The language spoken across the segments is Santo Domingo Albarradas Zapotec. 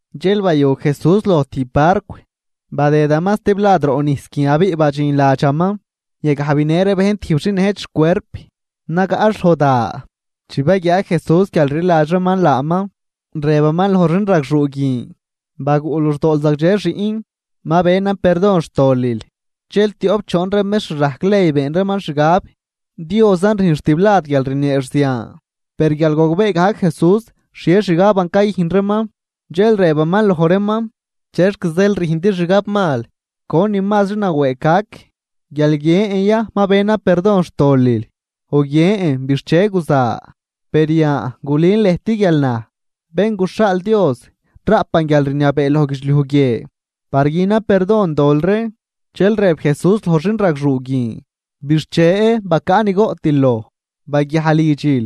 Dxel bayu Jesús loj tijb barcw, badëdaman stiblad roꞌ nijs guin abiꞌ badxin ladxaman. Yagaj binë ree bejn tijb xin nëjt xcuerp, nagaꞌx loj da. Chi baguiaa Jesús guial rliladx reeman laaman, rëbaman loj xin ragxuu guin: ―Baguꞌ luxdool zagdxe, xiꞌn. Ma benan perdon xtolil. Dxel tioꞌp choon ree mextr rajc ley been reeman xgab: “Diosan rüjnx tiblad guial rnieex zian.” Per guial gogbee gajc Jesús xhie xgaban cayüjn reeman, dxel rëbaman loj reeman: ―¿Chexc zeel rüjndi xgabmal? ¿Conin mazri nawëëg gac? ¿Guial guiën ya: “Ma benan perdon xtolil” o guiën: “Bixche, guza”? Per yan, gulün lëjt guial naj, Bén guxhaal Dios raꞌpan guialrniabee loj guidxliuj guie par günan perdon dol ree. Dxel rëb Jesús loj xin ragxuu guin: ―Bixche. Bacaꞌ ni goꞌtil loj. Baguiaj lidxil.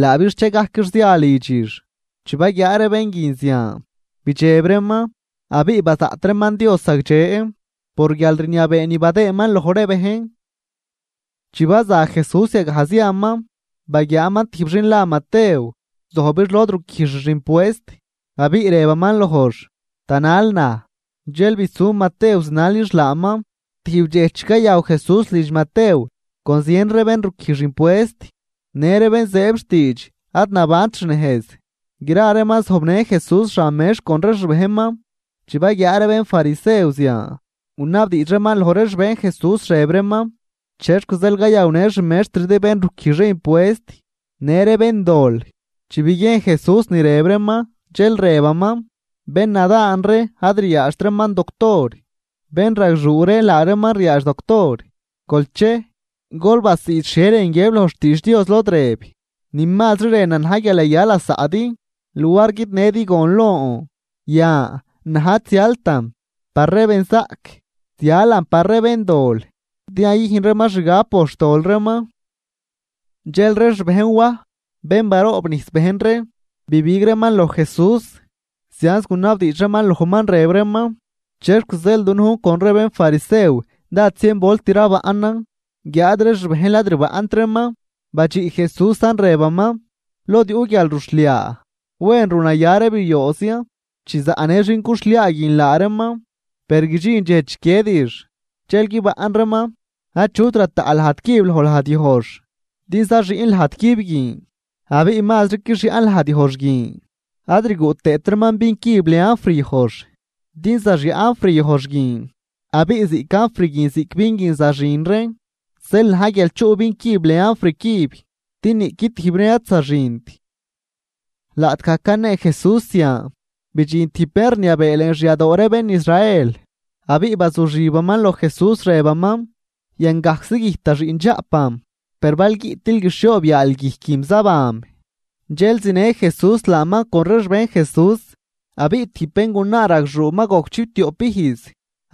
Laa bixchegajquix zia lidxix. Chi baguiaa ree bén guin zian, bidxeb reeman, abiꞌ bazaꞌt reeman Dios zagdxe por guialrniabee ni badëëman loj ree bejn. Chi baza Jesús yagaj ziaman, baguiaaman tijb xin la Matew. Zojbix lod ruquijxix impuest, abiꞌ rëbaman lojx: ―Tanal naj. Dxel bisu Matew zinalix laaman. Tijb dxej chi cayaw Jesús lidx Matew con zien ree bén ruquijx impuest në ree bén zëëb xtiidx ad nabant xnejz, gra reeman zojbnë Jesús xan mex con ree xbejnman. Chi baguiaa ree bénfarisew zian, gunabdiidx reeman loj ree xbejn Jesús rëb reeman: ―¿Chexc zeel cayawnë xmextridi bén ruquijx ree impuest në ree béndol? Chi biguiejn Jesús ni rëb reeman, dxel rëbaman: ―Bénnadaan ree ad ryaadxt reeman doctor, bénragxuu ree laa reeman ryaadx doctor. Gol chej, gol basiid xhie rën guiëb loj xtiidx Dios lod rëb: “Ni mazri rënan na̱j guial yaya lasaꞌdi luar guidnëdi gon lon.” Yan, naj ad zialtan par ree benzaꞌc, zialan par ree béndol, din yayüjn reeman xgab por xtol reeman. Dxel ree xbejn Waj, bén baroobnijs bejn ree, bibig reeman loj Jesús, zianz gunabdiidx reeman lojman, rëb reeman: ―¿Chexc zeel dunujn con ree bénfarisew dád zienvolt rabaꞌnan, guiáad ree xbejnl ad rbaꞌnt reeman? Badxiꞌ Jesúsan rëbaman: ―Lod yuꞌ guialruxhliaa, ¿wen runaya ree biooz ya chi zaꞌnë xin cuxhliaa guin laa reeman? Per guidxin dxej chiquiedix, dxel guibaꞌn reeman. ’Achut rataꞌ lajd cüb loj lajd yojx din zaxüꞌn lajd cüb guin, abiꞌ mazri quixyaꞌn lajd yojx guin. Ad rguꞌ tëët reeman vin cüb lën anfr yojx din zaxyaꞌ anfr yojx guin, abiꞌ ziꞌc anfr guin ziꞌc vin guin zaxin reen. Zeel na̱j guial chuꞌ vin cüb lën anfr cüb, din niꞌqui tijb reen ad zaxint. Laꞌtgaj canee Jesús zian, bidxin tijb bén rniabee lën xyadoo ree bén Israel, abiꞌ bazuxibaman loj Jesús, rëbaman: ―Yangajczi güjt da xiꞌndxaꞌpan, per bal guiꞌtil guixhioob yaal guijquim zabanm. Dxel zinë Jesús laaman con ree xbejn Jesús. Abiꞌ tijb béngunaa ragxuu ma gojc chiptioꞌp ijz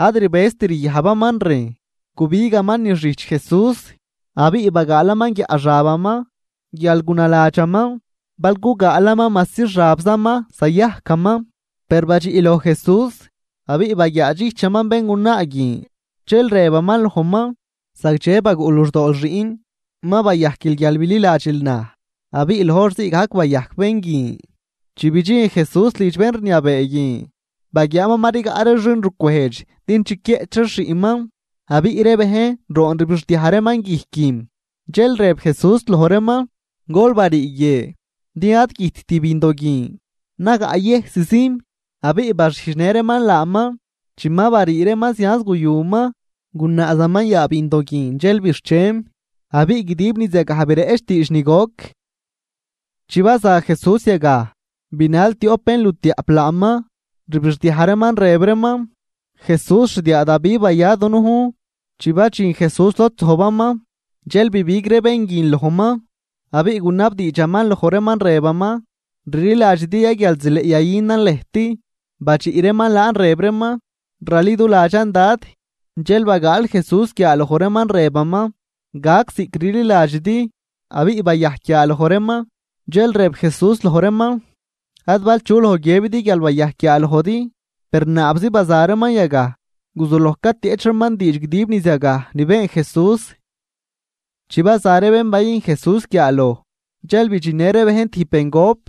ad rbëzt ryajbaman rejn, gubigaman niz xijch Jesús abiꞌ bagaalaman guiaꞌ xabaman, guial gunaladxaman: “Bal gugaalaman majsi xabzaman, zayajcaman.” Per badxiꞌ loj Jesús, abiꞌ baguiaadxijchaman béngunaa guin, dxel rëbaman lojman: ―Zagdxe baguꞌ luxdool, xiꞌn. Ma bayajquil guial bililadxil naj. Abiꞌ loj hor ziigajc bayajc bén guin. Chi bidxin Jesús lidx bén rniabee guin, baguiaaman ma rigaꞌ ree xinrucwejdx din chiquieꞌch reex xiꞌnman, abiꞌ ree bejn roon rbixdiaj reeman guijquim. Dxel rëb Jesús loj reeman: ―Gol barii guie, din ad güjtt bindo guin, nagaꞌyëjszim. Abiꞌ baxijdxnë reeman laaman. Chi ma barii reeman, zianz guyuman. Gunaazaman yaa bindo guin dxel bixchem. Abiꞌ guidib niz yagaj bireꞌch diidx ni goc. Chi baza Jesús yagaj, binal tioꞌp bénlutiaꞌp laaman, rbixdiaj reeman, rëb reeman: ―¡Jesús, xdiaa Davi, baya dunujn! Chi badxin Jesús lod zojbaman, dxel bibig ree bén guin lojman, abiꞌ gunabdiidxaman loj reeman, rëbaman: ―¿Rliladxidi ya guial zileꞌ yayünan lëjt? Badxiꞌ reeman laan rëb reeman: ―Raliduladxan, Dad. Dxel bagaal Jesús guiaaloj reeman, rëbaman: ―Gac ziꞌc rliladxidi. Abiꞌ bayajc guiaaloj reeman, dxel rëb Jesús loj reeman: ―Ad bal chu loj guiëbidi guial bayajc guiaalojdi. Per naabzi baza reeman yagaj, guzuloj catieꞌch reeman diidx guidib niz yagaj ni been Jesús. Chi baza ree bén bayüjn Jesús guiaaloj, dxel bidxinnë ree bejn tijb bengop,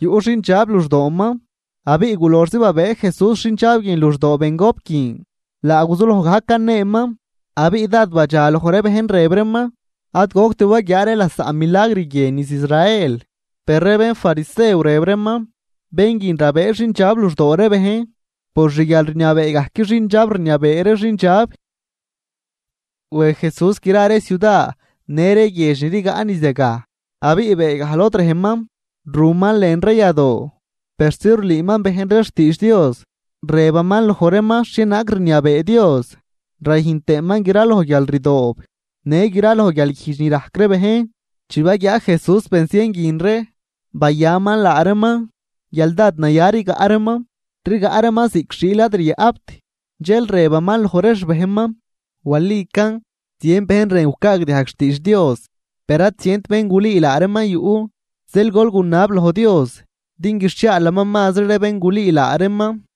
yuꞌ xindxab luxdooman. Abiꞌ guloxzi babëë Jesús xindxab guin luxdoo bengop guin, laa guzuloj gajc caneeman. Abiꞌ dád badxaloj ree bejn, rëb reeman: ―Ad goct waguiaa ree lasaꞌ milagr guie niz Israel. Per ree bénfarisew rëb reeman: ―Bén guin rabëë xindxab luxdoo ree bejn por xguialrniabee gajc xindxab rniabee ree xindxab. Wej Jesús gra ree ciuda në ree guiedx ni rigaꞌ niz yagaj, abiꞌ beegaj lod rejman ruman lën ree yadoo persi rulüüman bejn ree xtiidx Dios, rëbaman loj reeman xhienaag rniabee Dios, rayüjn tëëman graloj guialrdoob në graloj guialguijdx ni rajc ree bejn. Chi baguiaa Jesús benzien guin ree, bayaman laa reeman, guial dád naya rigaꞌ reeman, rigaꞌ reeman ziꞌc xiil ad ryaꞌpt. Dxel rëbaman loj ree xbejnman: ―Walican zien bejn rën gucaagdiajg xtiidx Dios, per ad zient bén gulüü laa reeman yuꞌ. Zeel gol gunab loj Dios din guixhiaalaman mazri ree bén gulüü laa reeman.